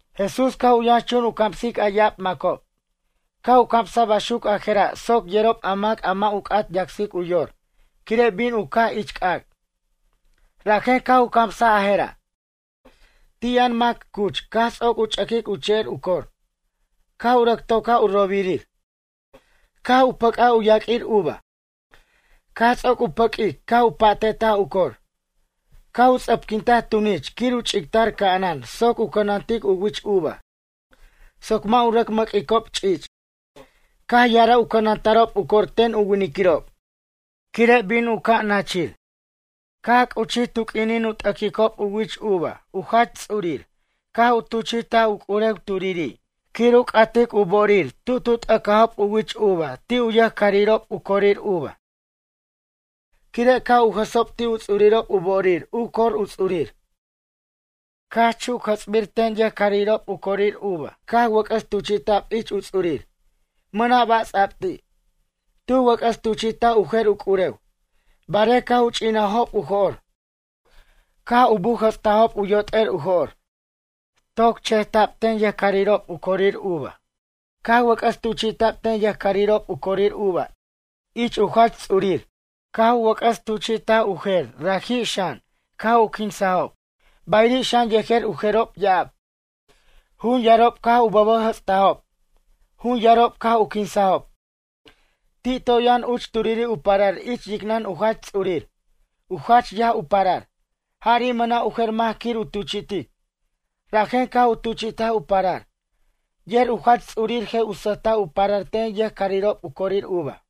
Jesús caj u yʌnxchun u camsic a ya'ab macob, caj u camsaj baxuc a jera' soc yerob a mac a mʌ' u c'at yacsic u yor quire' bin u caj ich c'ac'. Rajen caj u camsaj a jera': ―Ti' yʌn mac cuch caj ts'oc u ch'ʌquic u che'er u cor, caj u rʌc tocaj u robirir, caj u pʌc'aj u yaq'uir uva. Caj ts'oc u pʌq'uic caj u pa'te'taj u cor, caj u ts'ʌpquintaj tunich quir u ch'ictar ca'anan soc u cʌnantic u wich uva soc mʌ' u rʌc mʌq'uicob ch'ich'. ’Caj ya'araj u cʌnata'rob u cor ten u winiquirob, quire' bin u caj nachir. Caj c'uchij tu q'uinin u t'aquicob u wich uva u jach ts'urir caj u tuchi'taj u c'urew turiri' quir u c'atic u bo'orir tu tu t'acajob u wich uva ti' u yʌjcarirob u corir uva. Quire' ca' u jʌsob ti u ts'urirob u bo'orir u cor u ts'urir. Caj chuc jʌts'bir ten yʌjcarirob u corir uva caj wʌc'ʌs tuchi'ta'b ich u ts'urir, mʌna' ba' ts'a'b ti'. Tu wʌc'ʌs tuchi'taj u jer u c'urew, barej caj u ch'inajob u jo'r, caj u bujʌtstajob u yot'er u jo'r, toc cheta'b ten yʌjcarirob u corir uva caj wʌc'ʌs tuchi'ta'b ten yʌjcarirob u corir uva ich u jach ts'urir. Caj wʌc'ʌs tuchi'taj u jer raji' xan caj u quinsajob. Bayiri' xan yejer u jerob ya'ab, jun yarob caj u bʌbʌjʌtstajob, jun yarob caj u quinsajob. ’Ti' toy yʌn uch turiri' u parar ich yicnʌn u jach ts'urir, u jach yaj u parar. Jari' mʌna' u jer mac quir u tuchi'tic, rajen caj u tuchi'taj u parar. Yer u jach ts'urir je' u sʌjta' u parar ten yʌjcarirob u corir uva.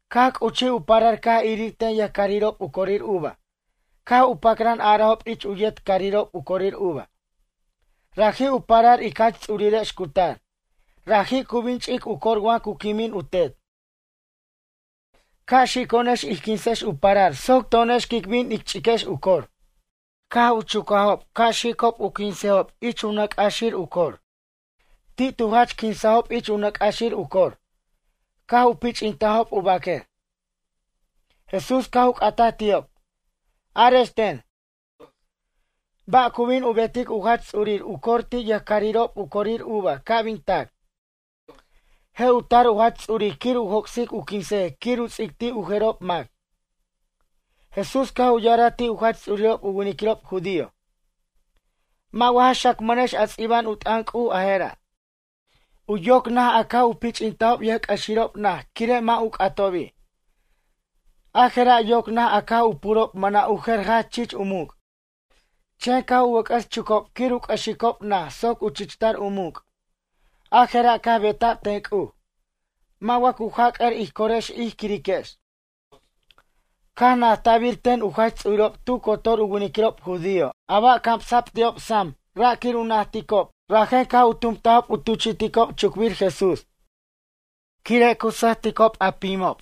Caj c'uchij u parar caj irir ten yʌjcarirob u corir uva caj u pacran arajob ich u yet carirob u corir uva: “Raji' u parar ic jach ts'urirex cu tar. Raji' cu bin ch'ic u cor wa cu quimin u tet. Ca' xico'onex ij quinsex u parar soc to'onex quic bin ic ch'iquex u cor.” Caj u chucajob ca' xicob u quinsejob ich u nʌc' c'axir u cor. Ti' tu jach quinsajob ich u nʌc' c'axir u cor, caj u pich'intajob u baquer. Jesús caj u c'ataj ti'ob: ―Arex ten, ba' cu bin u betic u jach ts'urir u cor ti' yʌjcarirob u corir uva ca' bin tac? Je' u tar u jach ts'urir quir u joc'sic u quinsej quir u ts'ic ti' u jerob mac. Jesús caj u ya'araj ti' u jach ts'urirob u winiquirob judío: ―Mʌ' wa ja xacmʌnex a ts'iba'an u t'ʌn C'uj a jera': U yoc naj a caj u pich'intajob yʌjc'ʌxirob naj quire' mʌ' u c'atobi'. A jera' yoc naj a caj u purob mʌna' u jer jach chich u muc'. Chen caj u wʌc'ʌs chucob quir u c'ʌxicob naj soc u chichtar u muc'. A jera' caj beta'b ten C'uj. Mʌ' wa cu jac'ar ij corex ij quiriquex? Caj najta'bir ten u jach ts'urirob tu cotor u winiquirob judío a ba' camsa'b ti'ob sam ra' quir u najticob rajen caj u tumtajob u tuchi'ticob chucbir Jesús. Quire' cu sʌjticob a pimob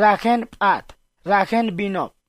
rajen p'at, rajen binob.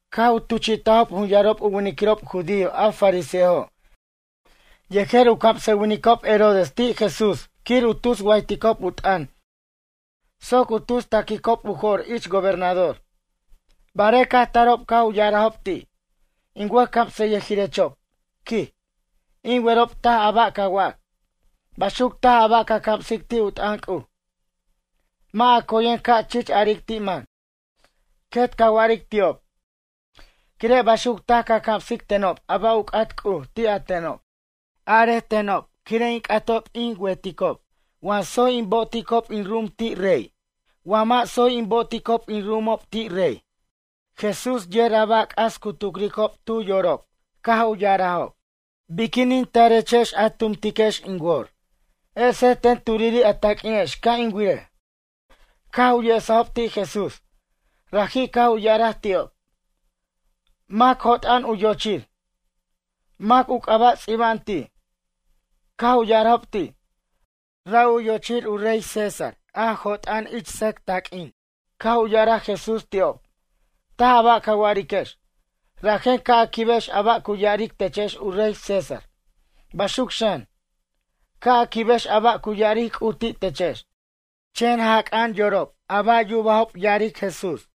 Caj u tuchi'tajob jun yarob u winiquirob judío a fariseojo' yejer u camsʌwinicob Herodes ti' Jesús quir u tus wayticob u t'ʌn soc u tus taquicob u jo'r ich gobernador. Barej caj tarob caj u ya'arajob ti': ―In wʌjcamsʌyʌjirechob ―quij―, in werob taj a ba' ca wac. Baxuc taj a ba' ca camsic ti' u t'ʌn C'uj. Mʌ' a coyen ca chich aric ti' mac, quet ca wa'aric ti'ob. Quire' baxuc taj ca camsic tenob a ba' u c'at C'uj ti' a tenob. Arej tenob quire' in c'atob in werob wa tsoy in bo'oticob in ru'umob ti' rey? Wa mʌ' tsoy in bo'oticob in ru'umob ti' rey? Jesús yer a ba' c'as cu tucricob tu yorob caj u ya'arajob: ―Biquinin tarechex a tumtiquex in wor? Esej ten turiri' a taq'uinex ca' in wirej. Caj u yesajob ti' Jesús. Raji' caj u ya'araj ti'ob: ―Mac jot'a'an u yo'ochir? Mac u c'aba' ts'iba'an ti'? Caj u ya'arajob ti': ―Ra' u yo'ochir u rey César, jot'a'an ich sʌc taq'uin. Caj u ya'araj Jesús ti'ob: ―Taj a ba' ca wa'ariquex. Rajen ca' a quibex a ba' cu ya'aric techex u rey César, baxuc xan, ca' a quibex a ba' a cu ya'aric C'uj ti' techex. Chan jac'a'an yorob a ba' yubajob ya'aric Jesús.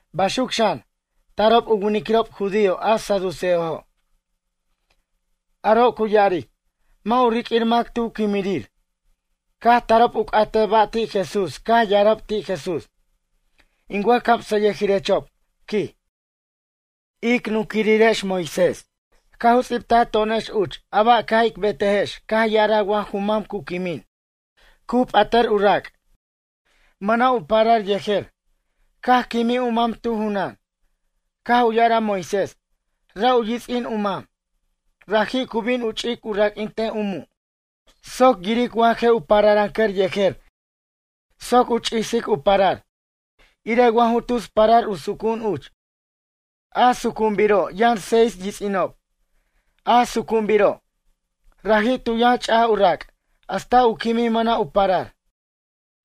Baxuc xan, tarob u winiquirob judío a saduceojo'. Aro' cu ya'aric: “Mʌ' u riq'uir mac tu quimirir.” Caj tarob u c'atej ba' ti' Jesús caj ya'arajob ti' Jesús: ―In wʌjcamsʌyʌjirechob ―quij―, ic nunquirirex Moisés caj u ts'ibtaj to'onex uch a ba' ca' ic betejex caj u ya'araj wa ju mam cu quimin, cu p'atʌr u rac', mʌna' u parar yejer, caj quimij u mam tu junan. Caj u ya'araj Moisés, ra' u yits'in u mam, raji' cu bin u ch'ic u raq'uintej u mu'. Soc yiric wa je' u pararʌncʌr yejer soc u ch'isic u parar, irej wa ju tus parar u sucu'un uch. A sucu'unbiro' yʌn seis yits'inob. A sucu'unbiro', raji' tu yʌn ch'aj u rac', hasta u quimij mʌna' u parar.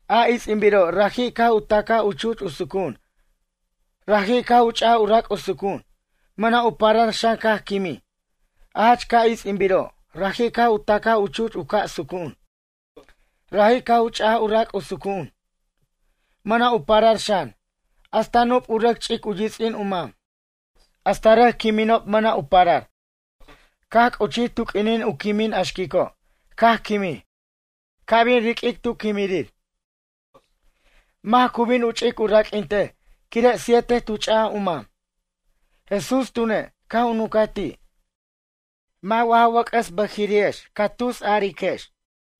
A its'inbiro', raji' caj u tacaj u chuch u sucu'un. Raji' caj u ch'aj u rac' u sucu'un, mʌna' u parar xan caj quimij, a jach ca' its'inbiro', raji' caj u tacaj u chuch u ca' sucu'un. Raji' caj u ch'aj u rac' u ca' sucu'un. Mʌna' u parar xan. Hasta nup u rʌc ch'ic u yits'in u mam, hasta rʌc quiminob mʌna' u parar, caj c'uchij tu q'uinin u quimin a xquico', caj quimij. Ca' bin riq'uic tu quimirir, mac cu bin u ch'ic u raq'uintej quire', siete tu ch'aj u mam? Jesús tune', caj u nuncaj ti': ―Mʌ' wa ja wʌc'ʌs bʌjiri'ex ca tusariquex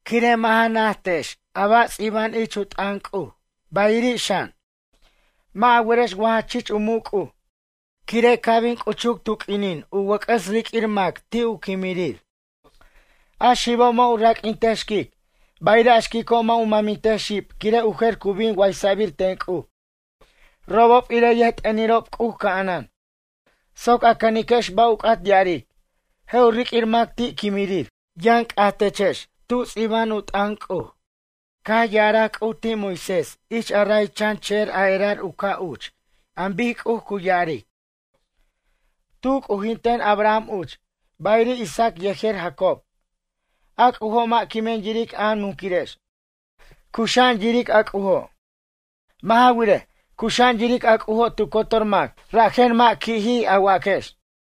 quire' mʌ' ja najtex a ba' ts'iba'an ich u t'ʌn C'uj bayiri' xan, mʌ' a werex wa jach chich u muc' C'uj. Quire' ca' bin c'uchuc tu q'uinin u wʌc'ʌs riq'uir mac ti' u quimirir, a xibo' mʌ' u raq'uintej xquic. Bayiri' a xquico' mʌ' u mʌmintej xib quire' u jer cu bin waysa'bir ten C'uj robob irej yʌjt'ʌnirob C'uj ca'anan. Soc a cʌniquex ba' u c'at ya'aric, je' u riq'uir mac ti' quimirir. Yʌn c'aj techex tub ts'iba'an u t'ʌn C'uj. Caj ya'araj C'uj ti' Moisés ich a ray chan che'er a erar u ca' uch an bic C'uj cu ya'aric: “Tu c'ujinten Abraham uch, bayiri' Isaac yejer Jacob.” A C'ujo' mʌ' quimen yiric a nunquirex, cuxa'an yiric a C'ujo'. Mʌ' ja wirej, cuxa'an yiric a C'ujo' tu cotor mac. Rajen mʌ' qui'jij a waquex.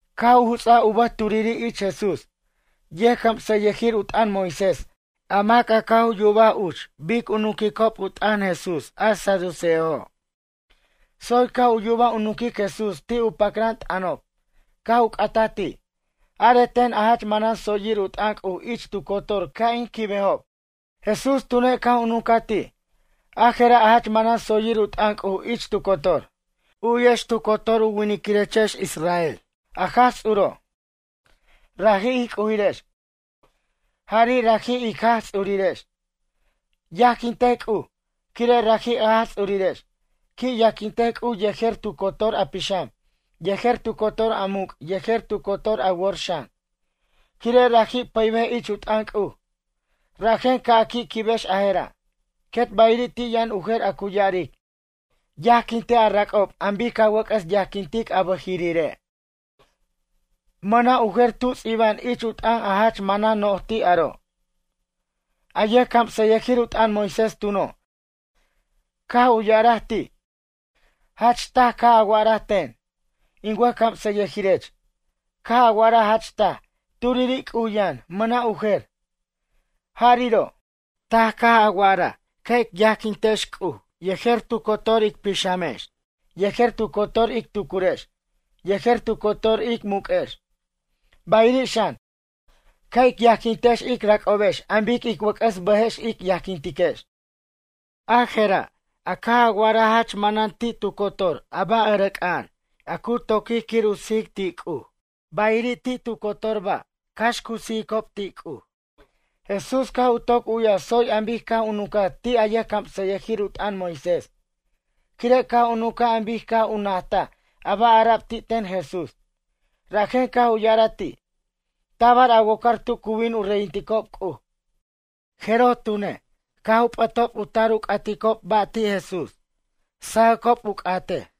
Caj u juts'aj u bʌj turiri' ich Jesús, yʌjcamsʌyʌjir u t'ʌn Moisés a mac caj u yubaj uch bic cu nunquicob u t'ʌn Jesús a saduceojo'. Tsoy caj u yubaj u nunquic Jesús ti' u pacran t'ʌnob, caj u c'ataj ti': ―Arej ten a jach manan tsoyir u t'ʌn C'uj ich tu cotor ca' in quibejob. Jesús tune' caj u nuncaj ti': ―A jera' a jach manan tsoyir u t'ʌn C'uj ich tu cotor: “U'yex tu cotor u winiquirechex israel a Jaj Ts'uro', raji' ij C'ujirex, jari' raji' ic Jaj Ts'urirex. Yajquintej C'uj, quire' raji' a Jaj Ts'urirex. Qui' yajquintej C'uj yejer tu cotor a pixam, yejer tu cotor a muc' yejer tu cotor a wor xan”, quire' raji' pʌybej ich u t'ʌn C'uj. Rajen ca' a qui' quibex a jera'. Quet bayiri' ti' yʌn u jer a cu ya'aric: “Yajquintej a rac'ob an bic ca wʌc'ʌs yajquintic a bʌjiri're'.” Mʌna' u jer tu ts'iba'an ich u t'ʌn a jach manan noj ti' aro'. A yʌjcamsʌyʌjir u t'ʌn Moisés tuno', caj u ya'araj ti': ―Jach taj caj a wa'araj ten, in wʌjcamsʌyʌjirech, caj a wa'araj jach taj, turiri' C'uj yʌn, mʌna' u jer, jariro'. Taj caj a wa'araj ca' ic yajquintex C'uj yejer tu cotor ic pixamex yejer tu cotor ic tucurex yejer tu cotor ic muq'uex, bayiri' xan, ca' ic yajquintex ic rac'obex an bic ic wʌc'ʌs bʌjex ic yajquintiquex, a jera' a caj a wa'araj jach manan ti' tu cotor a ba' ʌrʌc'a'an a cu toquic quir u sijic ti' C'uj, bayir' ti' tu cotor a ba' cax cu sijicob ti' C'uj. Jesús caj u toc u'yaj tsoy an bic caj u nuncaj ti' a yʌjcamsʌyʌjir u t'ʌn Moisés quire' caj u nuncaj an bic caj u najtaj a ba' ara'b ti' ten Jesús. Rajen caj u ya'araj ti': ―Tabar a wocar tu cu bin u reyinticob C'uj. Jeroj tune', caj p'atob u tar u c'aticob ba' ti' Jesús, sajʌcob u c'atej.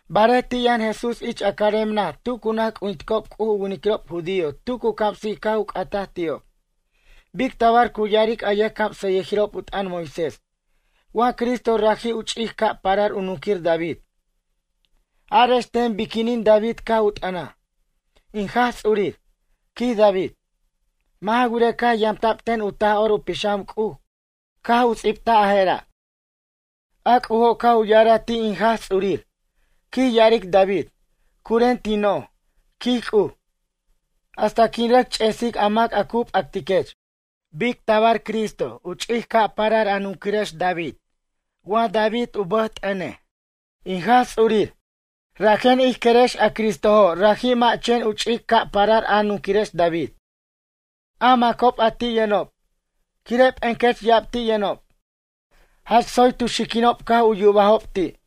Barej ti' yʌn Jesús ich a carem naj tu cu naj c'ujinticob C'uj u winiquirob judío tu cu camsic caj u c'ataj ti'ob: ―Bic tabar cu ya'aric a yʌjcamsʌyʌjirob u t'ʌn Moisés wa Cristo raji' u ch'ic ca' parar u nunquir David? Arex ten biquinin David caj u t'ʌnaj: “In Jaj Ts'urir” ―quij David. Mʌ' ja wirej caj yamta'b ten u Taj'or u Pixam C'uj caj u ts'ibtaj a jera': A C'ujo' caj u ya'araj ti' in Jaj Ts'urir, quij ya'aric David: “Curen tin noj, quij C'uj, hasta quin rʌc ch'esic a mac a cu p'atiquech.” Bic tabar Cristo u ch'ic ca' parar a nunquirex David wa David u bʌj t'ʌnej: “In Jaj Ts'urir”? Rajen ij querex a Cristojo' raji' mʌ' chen u ch'ic ca' parar a nunquirex David. A macob a ti' yʌnob, quire' p'encʌch ya'ab ti' yʌnob, jach tsoy tu xiquinob caj u yubajob ti'.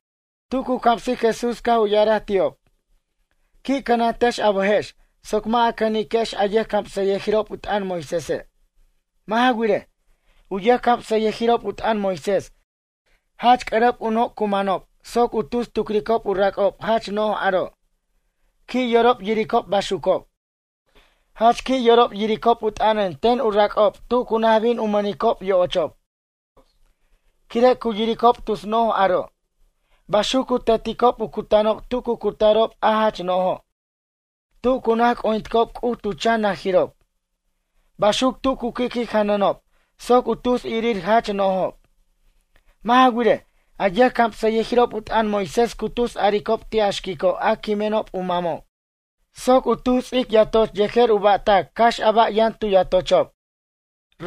Tu cu camsic Jesús caj u ya'araj ti'ob: ―Qui' cʌnantechex a bʌjex soc mʌ' a cʌniquex a yʌjcamsʌyʌjirob u t'ʌn Moisése'. Mʌ' ja wirej, u yʌjcamsʌyʌjirob u t'ʌn Moisés jach c'ʌrʌp u noc' cu manob soc u tus tucricob u rac'ob jach noj aro'. Qui' yorob yiricob baxucob. Jach qui' yorob yiricob u t'ʌnʌn ten u rac'ob tu cu naj bin u mʌnicob yo'ochob quire' cu yiricob tus noj aro'. Baxuc cu teticob u cutanob tu cu cutarob a jach no'ojo' tu cu naj c'ujinticob C'uj tu chan najirob. Baxuc tu cu qui'qui' janʌnob soc u tus irir jach nojob. Mʌ' ja wirej, a yʌjcamsʌyʌjirob u t'ʌn Moisés cu tus aricob ti' a xquico' a quimenob u mamob soc u tus ts'ic yatoch yejer u ba'tac cax a ba' yʌn tu yatochob.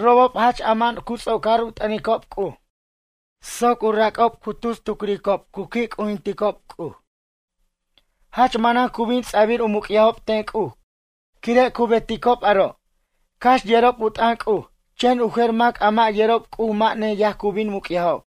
Robob jach ama'an cu ts'ocar u t'ʌnicob C'uj soc u rac'ob cu tus tucricob cu qui' c'ujinticob C'uj. Jach manan cu bin ts'abir u muc'yajob ten C'uj quire' cu beticob aro', cax yerob u t'ʌn C'uj. Chen u jer mac a mʌ' yerob C'uj mʌ' neyaj cu bin muc'yajob.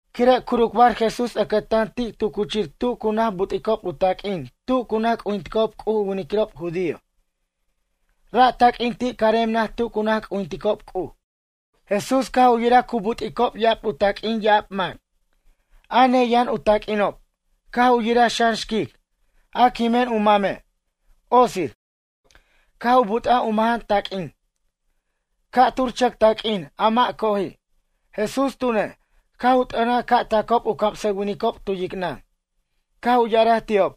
Quire' curucbar Jesús ʌcʌtan ti' tu cuchir tu cu naj but'icob taq'uin tu cu naj c'ujinticob C'uj u winiquirob judío. Ra' taq'uin ti' carem naj tu cu naj c'ujinticob C'uj. Jesús caj u yiraj cu but'icob ya'ab u taq'uin ya'ab mac, a neyʌn u taq'uinob. Caj u yiraj xan xquic, a quimen u mame', otsir, caj u but'aj u majan taq'uin, ca'tur chʌc taq'uin, a mʌ' coji'. Jesús tune', caj u t'ʌnaj ca' tacob u camsʌwinicob tu yicnʌn, caj u ya'araj ti'ob: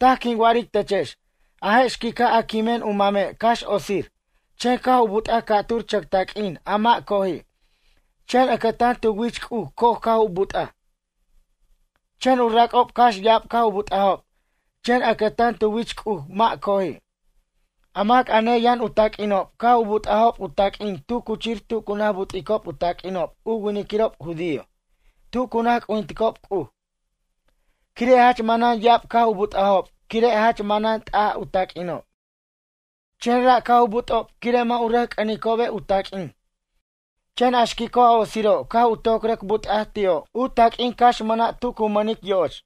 ―Taj quin wa'aric techex, a je' xquica' a quimen u mame' cax otsir, chen caj u but'aj ca'tur chʌc taq'uin a mʌ' coji', chen ʌcʌtan tu wich C'uj coj caj u but'aj. Chen u rac'ob cax ya'ab caj u but'ajob, chen ʌcʌtan tu wich C'uj mʌ' coji'. A mac a ne yan u taq'uinob caj u but'ajob u ta'quin tu cuchir tu cu naj but'icob u taq'uinob u winiquirob judío tu cu naj c'ujinticob C'uj. Quire' jach manan ya'ab caj u but'ajob quire' jach manan t'aj u taq'uinob, chen ra' caj u but'ob quire' mʌ' u rʌc c'ʌnicobe' u taq'uin. Chen a xquico' a otsiro' caj u toc rʌc but'aj ti'o' u ta'quin cax mʌna' tu cu mʌnic yo'och.